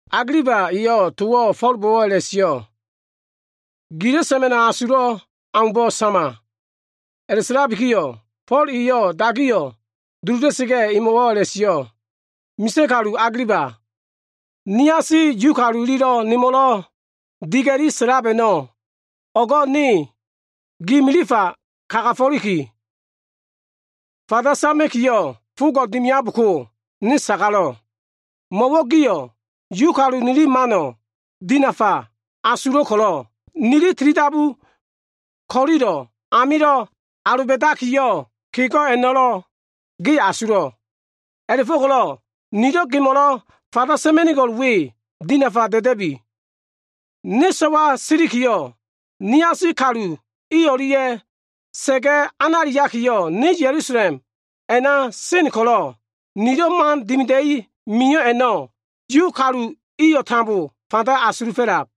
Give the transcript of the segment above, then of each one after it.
Agiliba eyo꞉ towo꞉ Fo꞉lbo꞉wo꞉ a꞉la꞉sio꞉, “Gilo꞉ sa꞉ma꞉no꞉ asulo꞉ aumbo꞉ sama.” A꞉la꞉sa꞉labiyo꞉, Fo꞉l eyo꞉ dagiyo꞉ duluda꞉sa꞉ga꞉, emo꞉wo꞉ a꞉la꞉sio꞉, “Misa꞉ kalu Agiliba, niasi Yu kalu ililo꞉ nemo꞉lo꞉ diga꞉li sa꞉lab a꞉no꞉ o꞉go꞉ ne gi milifa kagafo꞉liki, fanda sama꞉kiyo꞉ fogo꞉ dimiabko, ne sagalo꞉. Mo꞉wo꞉ giyo꞉ Yu nili mano꞉ dinafa asulo꞉ ko꞉lo꞉, nili tilidabu ko꞉lilo꞉ amilo꞉ aloba꞉dakiyo꞉ kego꞉ a꞉no꞉lo꞉ ge asulo꞉. A꞉la꞉fo꞉ko꞉lo꞉ nilo꞉ gemo꞉lo꞉ fanda sa꞉ma꞉nigo꞉l we, dinafa da꞉da꞉bi. “Ne so꞉wa silikiyo꞉, niasi kalu i o꞉lia꞉ sa꞉ga꞉ analiakiyo꞉ ne Ya꞉lusalem a꞉na sen ko꞉lo꞉, nilo꞉ man dimida꞉i mio꞉ a꞉no꞉ Yu kalu iyo꞉ tambo fanda asulufo꞉lab.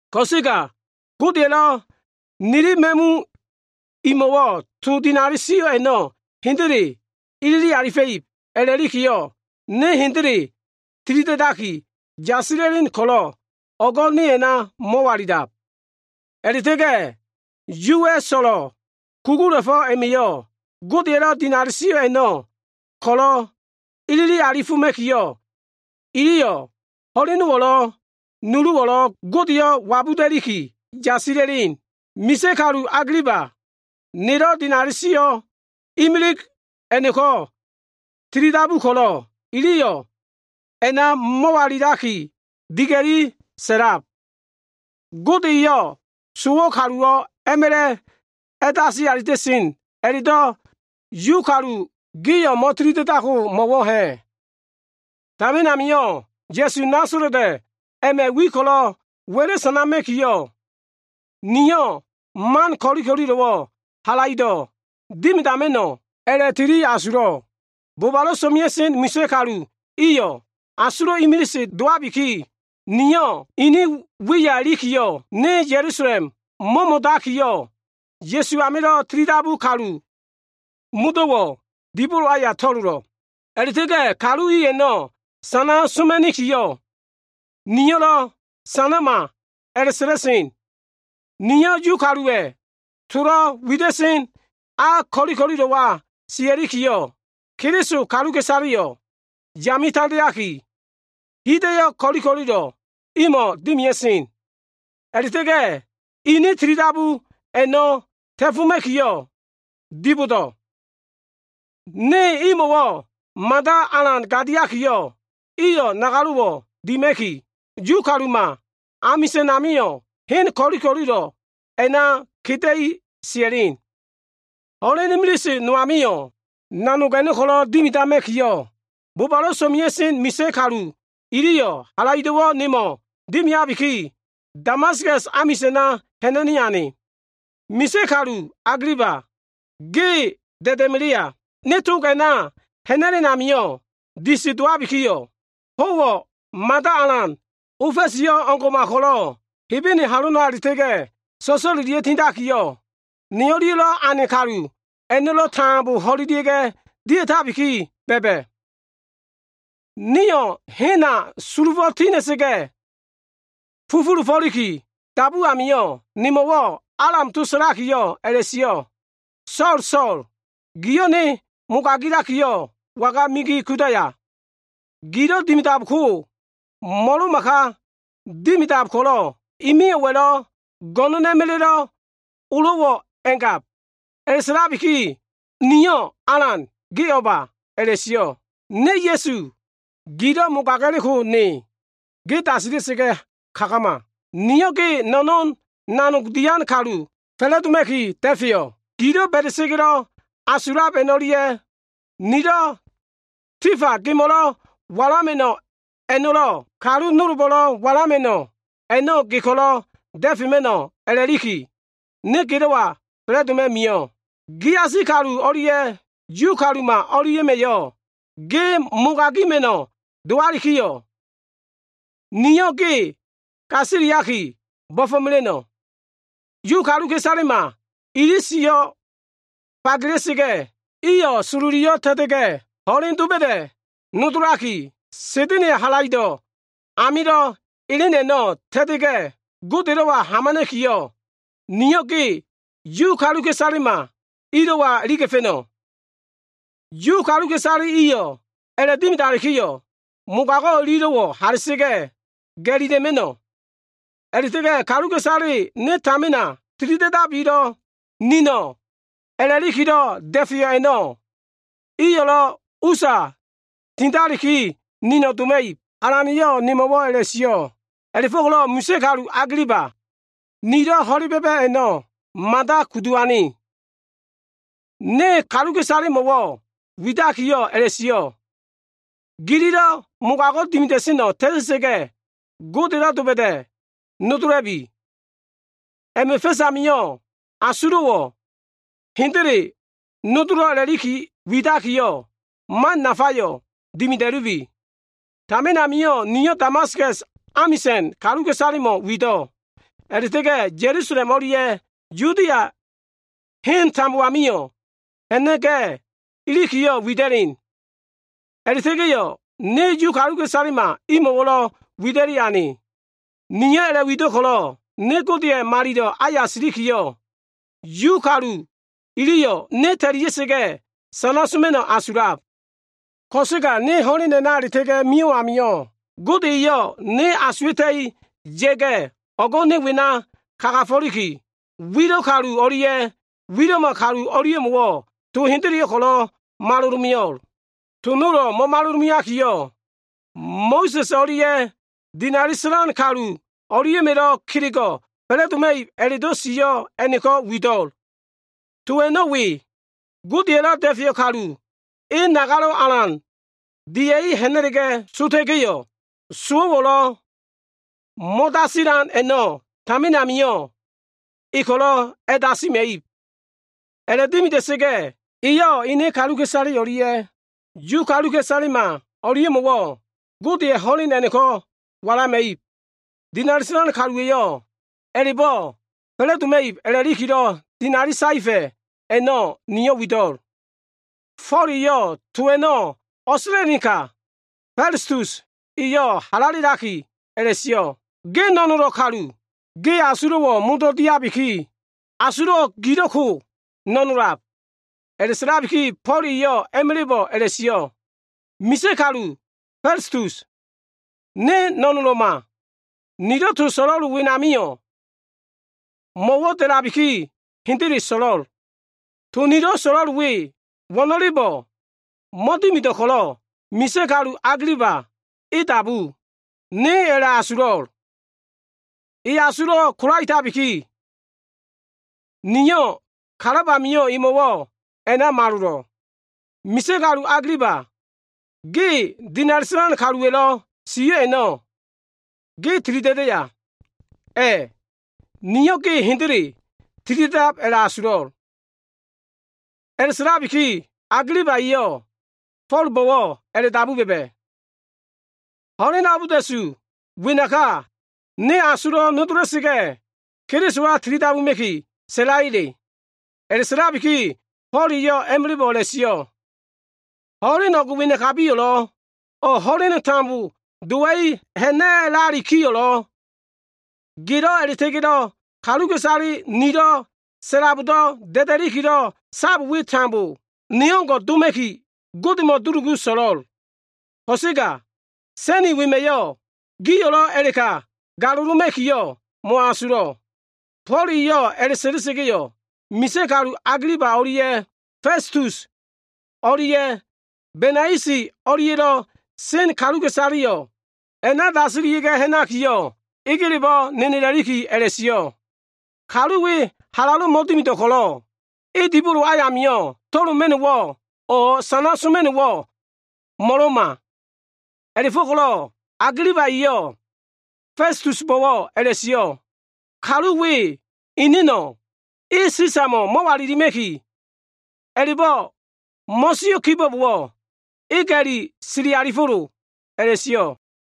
Ko꞉sega Gode eyo꞉ nili ma꞉mu imo꞉lo꞉ to dinali sio꞉ a꞉no꞉ hendele ilili alifa꞉ib a꞉la꞉likiyo꞉, ne hendele tilida꞉daki yasila꞉len ko꞉lo꞉, o꞉go꞉ ne a꞉na mo꞉walila꞉lab. A꞉la꞉ta꞉ga꞉ Yuwa꞉ so꞉lo꞉ kugula꞉fo꞉ a꞉ma꞉yo꞉ Godeya꞉lo꞉ dinali sio꞉ a꞉no꞉ ko꞉lo꞉ ilili alifoma꞉kiyo꞉, iliyo꞉ ho꞉lenowo꞉lo꞉, nuluwo꞉lo꞉ Godeyo꞉ wabuda꞉liki yasila꞉sen. Misa꞉ kalu Agiliba, nelo꞉ dinali sio꞉ imilig a꞉no꞉ko꞉ tilidabu ko꞉lo꞉, iliyo꞉ a꞉na mo꞉walilaki diga꞉li sa꞉lab. Gode eyo꞉ sowo꞉ kaluwo꞉ a꞉ma꞉la꞉ a꞉dasi alita꞉sen a꞉la꞉do꞉ Yu kalu gio꞉ mo꞉tili da꞉daidko mo꞉wo꞉ ha꞉? “Tamin amio꞉, Nasala꞉t kalu Ya꞉suwa꞉ wiyo꞉ ko꞉lo꞉ wa꞉la꞉ sanama꞉kiyo꞉, niyo꞉ man ko꞉li ko꞉lilo꞉wo꞉ halaido꞉ dimidama꞉no꞉ a꞉la꞉liki tili asulo꞉. Bobalo꞉ so꞉mea꞉sen misa꞉ kalu iyo꞉ asulo꞉ imilise dowabiki, niyo꞉ ini wiya ilikiyo꞉, ne Ya꞉lusalem mo꞉mo꞉dakiyo꞉, Ya꞉su amilo꞉ tilidabu kalu modo꞉wo꞉ dibolo aya to꞉lolo꞉. A꞉la꞉ta꞉ga꞉ kalu i a꞉no꞉ sana soma꞉nikiyo꞉, niyo꞉lo꞉ ‘sanama’ a꞉la꞉sa꞉la꞉sen. Niyo꞉ Yu kaluwa꞉ tolo꞉ wida꞉sen a ko꞉li ko꞉lilo꞉wa sia꞉likiyo꞉, Keliso kaluka꞉isaleyo꞉ yame tandeaki, hida꞉yo꞉ ko꞉li ko꞉lilo꞉ a꞉no꞉ imo꞉wo꞉ dimia꞉sen. A꞉la꞉ta꞉ga꞉ ini tilidabu a꞉no꞉ ta꞉foma꞉kiyo꞉ dibodo꞉. Ne imo꞉wo꞉ mada alan gadiakiyo꞉, iyo꞉ nagalo꞉wo꞉ dima꞉ki, Yu kaluma amisa꞉n amio꞉ hen ko꞉li ko꞉lilo꞉ a꞉na keda꞉li sia꞉len. “Ho꞉len imilise no amio꞉, nanog a꞉no꞉ ko꞉lo꞉ dimidama꞉kiyo꞉, bobalo꞉ so꞉mea꞉sen misa꞉ kalu iliyo꞉ halaido꞉wo꞉ nemo꞉ dimiabiki, Damaskas amisa꞉na ha꞉na꞉ni ane. Misa꞉ kalu, Agiliba ge da꞉da꞉melea. Ne tog a꞉na ha꞉na꞉len amio꞉ disi dowabikiyo꞉, ho꞉wo꞉ mada alan, ofa꞉siyo꞉ o꞉ngo꞉ma ko꞉lo꞉ Hebene halona a꞉la꞉ta꞉ga꞉ so꞉so꞉lelia꞉ga꞉ tindakiyo꞉, ne o꞉lia꞉lo꞉ ane kalu a꞉no꞉lo꞉ tambo ho꞉lelia꞉ga꞉ dia꞉tabiki ba꞉ba꞉. Nio꞉ hena sulufo꞉ ti ha꞉na꞉sa꞉ga꞉, fufulufo꞉liki dabu amio꞉, nemo꞉wo꞉ Alam to sa꞉lakiyo꞉ a꞉la꞉sio꞉, ‘So꞉l, So꞉l giyo꞉ Ne mogagakiyo꞉, waga migi kudaya? Gilo꞉ dimidako, mo꞉lo꞉ma ka dimidab ko꞉lo꞉ i miyo꞉wa꞉lo꞉ go꞉no꞉n a꞉ma꞉la꞉lo꞉ olo꞉wo꞉ a꞉ngab.’ “A꞉la꞉sa꞉labiki, niyo꞉ ‘Alan, ge o꞉ba?’ a꞉la꞉sio꞉. “ ‘Ne Ya꞉su. Gilo꞉ mogaga꞉leko Ne. Ge dasila꞉sa꞉ga꞉ kagama. Niyo꞉ ge no꞉no꞉n nanog dian kalu fa꞉la꞉doma꞉ki da꞉feyo꞉. Gilo꞉ ba꞉da꞉sa꞉ga꞉lo꞉ asululiab a꞉no꞉lia꞉, nilo꞉ tifa gemo꞉lo꞉ a꞉walama꞉no꞉ a꞉no꞉lo꞉, kalu nolbo꞉lo꞉ walama꞉no꞉ a꞉no꞉ ge ko꞉lo꞉ da꞉fema꞉no꞉ a꞉la꞉liki, ne gelo꞉wa fa꞉la꞉doma꞉ mio꞉. Giasi kalu o꞉lia꞉ Yu kaluma o꞉lia꞉ma꞉yo꞉ ge mogagima꞉no꞉ dowalikiyo꞉, niyo꞉ ge gasiliaki bo꞉fo꞉mela꞉no꞉. Yu kaluka꞉isalema ili siyo꞉ fagela꞉sa꞉ga꞉, iyo꞉ sololiyo꞉ ta꞉ta꞉ga꞉, ho꞉len doba꞉da꞉ nodolaki, Sa꞉da꞉na꞉ya꞉ halaido꞉ amilo꞉ elen a꞉no꞉ ta꞉ta꞉ga꞉ Godelo꞉wa hamana꞉kiyo꞉, Niyo꞉ ge Yu kaluka꞉isalema ilo꞉wa iliga꞉fa꞉no꞉. Yu kaluka꞉isale iyo꞉ a꞉la꞉dimidalikiyo꞉, mogago꞉ ililo꞉wo꞉ hala꞉sa꞉ga꞉ ga꞉lila꞉ma꞉no꞉. A꞉la꞉ta꞉ga꞉, kaluka꞉isale ne tamina tilida꞉dabilo꞉ nino꞉ a꞉la꞉likilo꞉ da꞉feyo꞉ a꞉no꞉, iyo꞉lo꞉ usa tindaliki nino꞉ doma꞉ib.’ Alana꞉yo꞉ nemo꞉wo꞉ a꞉la꞉sio꞉. “A꞉la꞉fo꞉ko꞉lo꞉ misa꞉ kalu Agiliba, nilo꞉ ho꞉le ba꞉ba꞉ a꞉no꞉ mada kudu ane. Ne kaluka꞉isalemo꞉wo꞉ widakiyo꞉ a꞉la꞉sio꞉, ‘Gililo꞉ mogago꞉ dimida꞉seno꞉ ta꞉ta꞉sa꞉ga꞉, Godelo꞉ doba꞉da꞉ nodola꞉bi. A꞉ma꞉ fa꞉s amio꞉, asulo꞉wo꞉ hendele nodolo꞉ a꞉la꞉liki widakiyo꞉, man nafayo꞉ dimida꞉lubi.’ Tamin amio꞉ niyo꞉ Damaskas amisa꞉n kaluka꞉isalemo꞉ wido꞉. A꞉la꞉ta꞉ga꞉ Ya꞉lusalem o꞉lia꞉ Yudia heno꞉ tambo amio꞉ ha꞉na꞉ga꞉ ilikiyo꞉ wida꞉len. A꞉la꞉ta꞉ga꞉ niyo꞉ Yu kaluka꞉isalema imo꞉wo꞉lo꞉ wida꞉li ane. Niyo꞉ a꞉la꞉wido꞉ ko꞉lo꞉, ne Godeya꞉ malilo꞉ aya silikiyo꞉, Yu kalu iliyo꞉ ne ta꞉lia꞉sa꞉ga꞉, sana soma꞉no꞉ asulab. Ko꞉sega ho꞉len a꞉na a꞉la꞉ta꞉ga꞉ mio꞉ amio꞉, Gode eyo꞉ ne asuwa꞉ta꞉i ya꞉ga꞉, o꞉go꞉ ne wena kagafo꞉liki, wilo꞉ kalu o꞉lia꞉ wilo꞉ma kalu o꞉lia꞉mo꞉wo꞉ to hendeleyo꞉ ko꞉lo꞉ malolomeo꞉l. To nolo꞉ mo꞉malolomeakiyo꞉, Mo꞉sa꞉s o꞉lia꞉ dinali sa꞉lan kalu o꞉lia꞉ma꞉lo꞉ kelego꞉ fa꞉la꞉doma꞉ib a꞉la꞉do꞉ sio꞉ a꞉no꞉ko꞉ wido꞉l. To a꞉no꞉ we, Godeya꞉lo꞉ Da꞉feyo꞉ Kalu e nagalo꞉ alan dia꞉li ha꞉na꞉ga꞉ sota꞉ga꞉yo꞉, sowo꞉lo꞉ mo꞉dasilan a꞉no꞉ tamin amio꞉ e ko꞉lo꞉ a꞉dasima꞉ib. A꞉la꞉dimida꞉sa꞉ga꞉, eyo꞉ ene kaluka꞉isale o꞉lia꞉ Yu kaluka꞉isalema o꞉lia꞉mo꞉wo꞉ Godeya꞉ ho꞉len a꞉no꞉ ko꞉lo꞉ walama꞉ib. Dinali sa꞉lan kaluwa꞉yo꞉ a꞉la꞉bo꞉ fa꞉la꞉doma꞉ib a꞉la꞉likilo꞉ dinali saefa꞉ a꞉no꞉ niyo꞉ wido꞉l.” Fo꞉l eyo꞉ to a꞉no꞉ o꞉sa꞉la꞉lenka, Festus eyo꞉ halalelaki a꞉la꞉sio꞉, “Ge no꞉nolo꞉ kalu. Ge asulo꞉wo꞉ modo꞉ diabiki, asulo꞉ gilo꞉ ko no꞉nolab.” A꞉la꞉sa꞉labiki, Fo꞉l eyo꞉ a꞉ma꞉la꞉bo꞉ a꞉la꞉sio꞉, “Misa꞉ kalu Festus, ne no꞉nolo꞉ma. Nilo꞉ to so꞉lo꞉l wenamio꞉, mo꞉wo꞉ da꞉labiki hendele so꞉lo꞉l. To nilo꞉ so꞉lo꞉l we, wo꞉no꞉lebo꞉ mo꞉dimido꞉ ko꞉lo꞉, misa꞉ kalu Agiliba e dabulab, niyo꞉ a꞉la꞉asulo꞉l. E asulo꞉ ko꞉lo꞉labiki, niyo꞉ kalab amio꞉ emo꞉wo꞉ a꞉na malolo꞉. Misa꞉ kalu Agiliba ge, dinali sa꞉lan kaluwa꞉lo꞉ sio꞉ a꞉no꞉ ge tilida꞉daya? A꞉, niyo꞉ ge hendele tilida꞉dab a꞉la꞉asulo꞉l.” A꞉la꞉sa꞉labiki Agiliba eyo꞉ Fo꞉lbo꞉wo꞉ a꞉la꞉dabu ba꞉ba꞉, “Ho꞉len abolda꞉su wenaka, ne asulo꞉wo꞉ nodola꞉sa꞉ga꞉, Kelisowa tilidabuma꞉ki sa꞉layele?” A꞉la꞉sa꞉labiki Fo꞉l eyo꞉ a꞉ma꞉la꞉bo꞉ a꞉la꞉sio꞉, “Ho꞉len o꞉g wenakabiyo꞉lo꞉ o꞉ ho꞉len tambo dowa꞉i ha꞉na꞉lalikiyo꞉lo꞉, gelo꞉ a꞉la꞉ta꞉ga꞉ kaluka꞉isale nilo꞉ sa꞉labdo꞉ da꞉da꞉likilo꞉ sab we tambo, ne o꞉ngo꞉ doma꞉ki, Godemo꞉ dulugu so꞉lo꞉l. Ko꞉sega sa꞉ni wema꞉yo꞉ giyo꞉lo꞉ a꞉la꞉ka galoloma꞉kiyo꞉ mo꞉asulo꞉.” Fo꞉l eyo꞉ a꞉la꞉sa꞉la꞉sa꞉ga꞉yo꞉, misa꞉ kalu Agiliba o꞉lia꞉ Festus o꞉lia꞉ Benaisi o꞉lia꞉lo꞉ sen kaluka꞉isaleyo꞉ a꞉na dasilia꞉ga꞉ ha꞉nakiyo꞉, egelebo꞉ nenelakiyo꞉ a꞉la꞉sio꞉, “Kalu we halalo꞉ mo꞉dimido꞉ ko꞉lo꞉, e dibolo amio꞉ to꞉loma꞉no꞉wo꞉ o꞉ sana soma꞉no꞉wo꞉ mo꞉lo꞉ma.” A꞉la꞉go꞉ko꞉lo꞉ Agiliba eyo꞉ Festusbo꞉wo꞉ a꞉la꞉sio꞉, “Kalu we eneno꞉ e Sisamo꞉ mo꞉walilima꞉ki a꞉la꞉bo꞉ mo꞉sio꞉ kibo꞉bowo꞉, e ga꞉li sili alifo꞉lo” a꞉la꞉sio꞉.